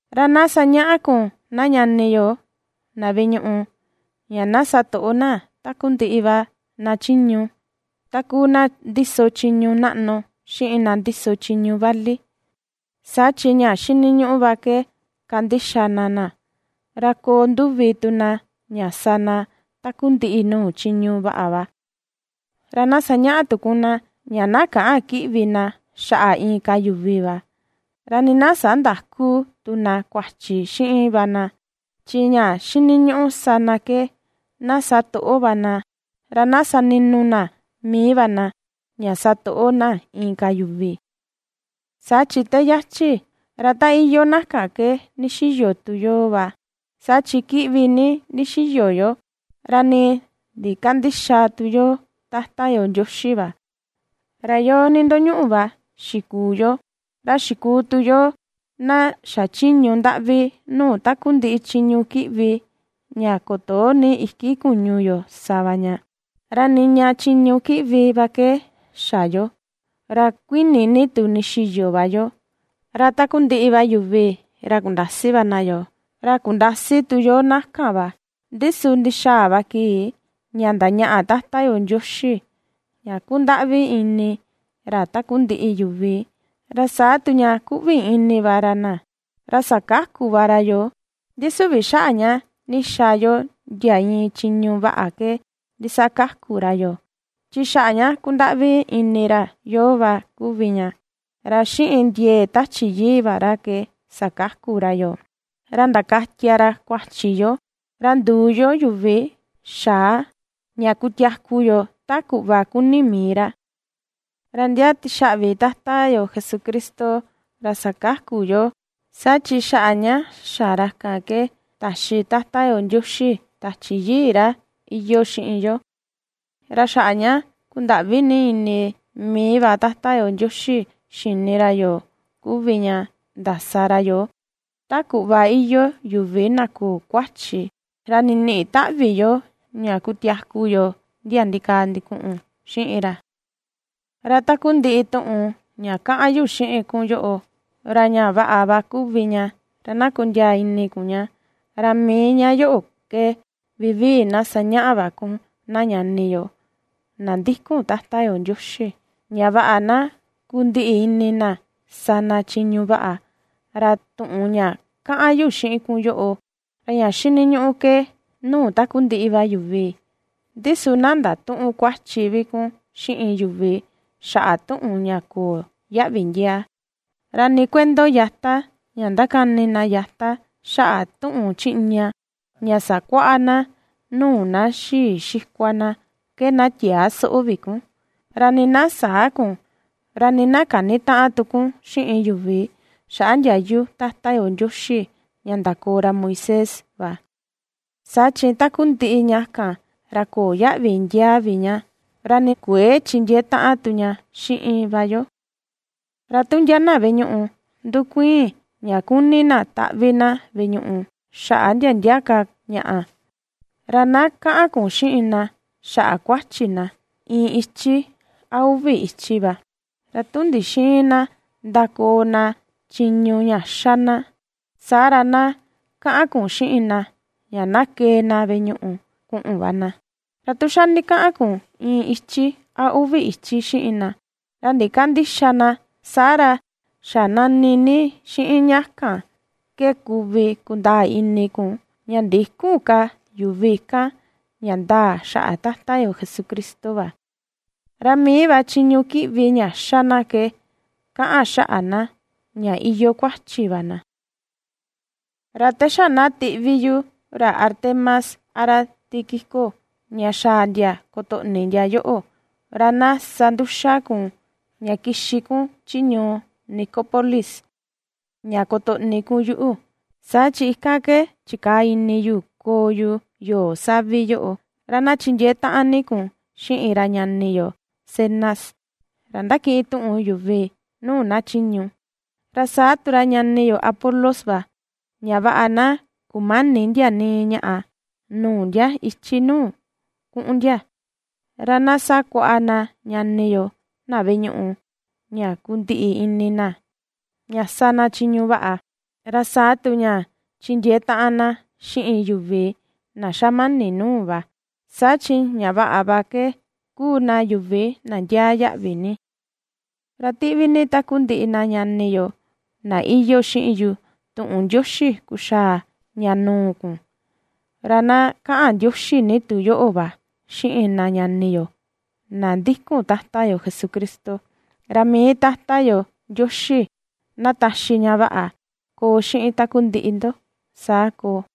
Ra na sañaꞌa kun na ñani yo na veꞌe ñuꞌu, ña na satoꞌo na takundiꞌi va na chiñu, ta kuu na ndiso chiñu naꞌnu xiꞌin na ndiso chiñu vali, saa chi ña xiniñuꞌu va ke kandixa na na, ra koo nduvi tu na ña sa na takundiꞌi nuu chiñu vaꞌa va. Ra na sañaꞌa tu kun na, ña na käꞌan kiꞌvi na xaꞌa inka yuvi va, ra nii na sandäku tu na kuachi xiꞌin va na, chi ña xiniñuꞌu sa na ke, na sa toꞌo va na, ra na sani̱nu̱ na mii na, ña sa toꞌo na inka yuvi. Saa chi te yachi, ra ta iyoo na kan ke ndixiyo tu yoo va, saa chi kiꞌvi ni ndixiyo yo, ra nii ndikandïxa tu yo Tata yo Ndioxi va; ra yo nindoñuꞌu va xikuu yo, ra xikuu tu yo na xachiñu ndaꞌvi nuu takundiꞌi chiñu kiꞌvi ña kutoo ni iki kuñu yo sa va ña. Ra niña chiñu kiꞌvi va ke xa yo, ra kuini ni tu ndixiyo va yo, ra takundiꞌi va yuvi ra kundasi va na yoo, ra kundasi tu yoo na kan va. Ndi su ndixaa va kii, ña ndañaꞌa Tata yo Ndioxi, ña ^kundaꞌvi ini ra takundiꞌi yuvi, ra saa tu ña ^kuꞌvi ini va ra na, ra sakaku va ra yoo, ndi su süvi xaꞌa ña ndixa yo ndia iin chiñu vaꞌa ke ndisakaku ra yoo, chi xaꞌa ña kundaꞌvi ini ra yoo va kuvi ña. Ra xiꞌin ndiee Tachi Yii va ra ke sakaku ra yoo, ra ndakatia ra kuachi yo, ra nduu yo yuvi xa̱a ña kutiaku yo ta kuꞌva kuni mii ra. Ra ndia tixaꞌvi Tata yo Jesucristo, ra ^sakaku yoo, saa chi xaꞌa ña xa ra kan ke, taxi Tata yo Ndioxi Tachi Yii ra iyoo xiꞌin yo. Ra xaꞌa ña kundaꞌvi ni ini mii va Tata yo Ndioxi xini ra yoo kuvi ña ndasa ra yoo ta kuꞌva iyoo yuvi na köo kuachi, ra ndiniꞌi taꞌvi yo ña kutiaku yo ndia ndikaa ndikuꞌun xiꞌin ra. Ra takundiꞌi tuꞌun ña kaꞌan yu xiꞌin kun yoꞌo, ra ña vaꞌa va kuvi ña ra na kondiaa ini kun ña, ra mii ña yoꞌo ke vivii na sañaꞌa va kun na ñani yo na ndikun Tata yo Ndioxi, ña vaꞌa na kundiꞌi ini na sa na chiñu vaꞌa. Ra tuꞌun ña kaꞌan yu xiꞌin kun yoꞌo, ra ña xiniñuꞌu ke nuu takundiꞌi va yuvi. Ndi su na ndatüꞌun kuachi vi kun xiꞌin yuvi xaꞌa tuꞌun ña köo yaꞌvi ndiaa; ra nii kuento yata, ña ^ndakani na yata xaꞌa tuꞌun chiꞌña ña sakuaꞌa na nuu na xii xikua na ke na tiäa soꞌo vi kun; ra nii na säa kun, ra nii na känitaꞌan tu kun xiꞌin yuvi xaꞌa ndiayu Tata yo Ndioxi ña ndakoo ra Moisés va. Saa chi takundiꞌi ña kan, ra köo yaꞌvi ndiaa vi ña, ra nii kuëe chindiee taꞌan tu ña xiꞌin va yo. Ra tu ndia na veꞌe ñuꞌu ndukuiin ña kuni na taꞌvi na veꞌe ñuꞌu, xaꞌa ndia ndia ka ñaꞌa, ra na kaꞌan kun xiꞌin na xaꞌa kuachi na, iin ichi a uvi ichi va, ra tu ndixïin na ndakoo na chiñu ña ^xa na, saa ra na kaꞌan kun xiꞌin na ña na kee na veꞌe ñuꞌu kuꞌun va na; ra tu xa ndikaꞌan kun iin ichi a uvi ichi xiꞌin na, ra ndikandïxa na, saa ra xa nani xiꞌin ña kan ke kuvi kundaa ini kun, ña ndïkun ka yuvi kan ña ndaa xaꞌa Tata yo Jesucristo va, ra mii va chiñu kiꞌvi ña xa na ke kaꞌan xaꞌa na ña iyoo kuachi va na. Ra te xa na tiꞌvi yu ra Artemas a ra Tíquico ña xaa ndia kutoꞌni ndia yoꞌo, ra na sa nduxa kun ña kixi kun chi ñuu Nicópolis ña kutoꞌni kun yuꞌu, saa chi ikan ke chikaa ini yu koo yu yoo savi yoꞌo. Ra na chindiee taꞌan ni kun xiꞌin ra ñani yo Zenas, ra ^ndakiꞌin tuꞌun yuvi nuu na chiñu, ra saa tu ra ñani yo Apolos va, ña vaꞌa na kumäni ndia nii ñaꞌa nuu ndia ichi nuu kuꞌun ndia. Ra na sakuaꞌa na ñani yo, na veꞌe ñuꞌu ña kundiꞌi ini na ña sa na chiñu vaꞌa, ra saa tu ña chindiee taꞌan na xiꞌin yuvi na xamani nuu va, saa chi ña vaꞌa va ke kuu na yuvi na ndiaa yaꞌvi ni. Ra ^tiꞌvi ni takundiꞌi na ñani yo, na iyoo xiꞌin yu tuꞌun ndioxi kuxaa ña nuu kun. Ra na kaꞌan ndioxi ni tu yoꞌo va xiꞌin na ñani yo, na ndikun Tata yo Jesucristo. Ra mii Tata yo Ndioxi na taxi ña vaꞌa koo xiꞌin takundiꞌi ndo. Saa koo.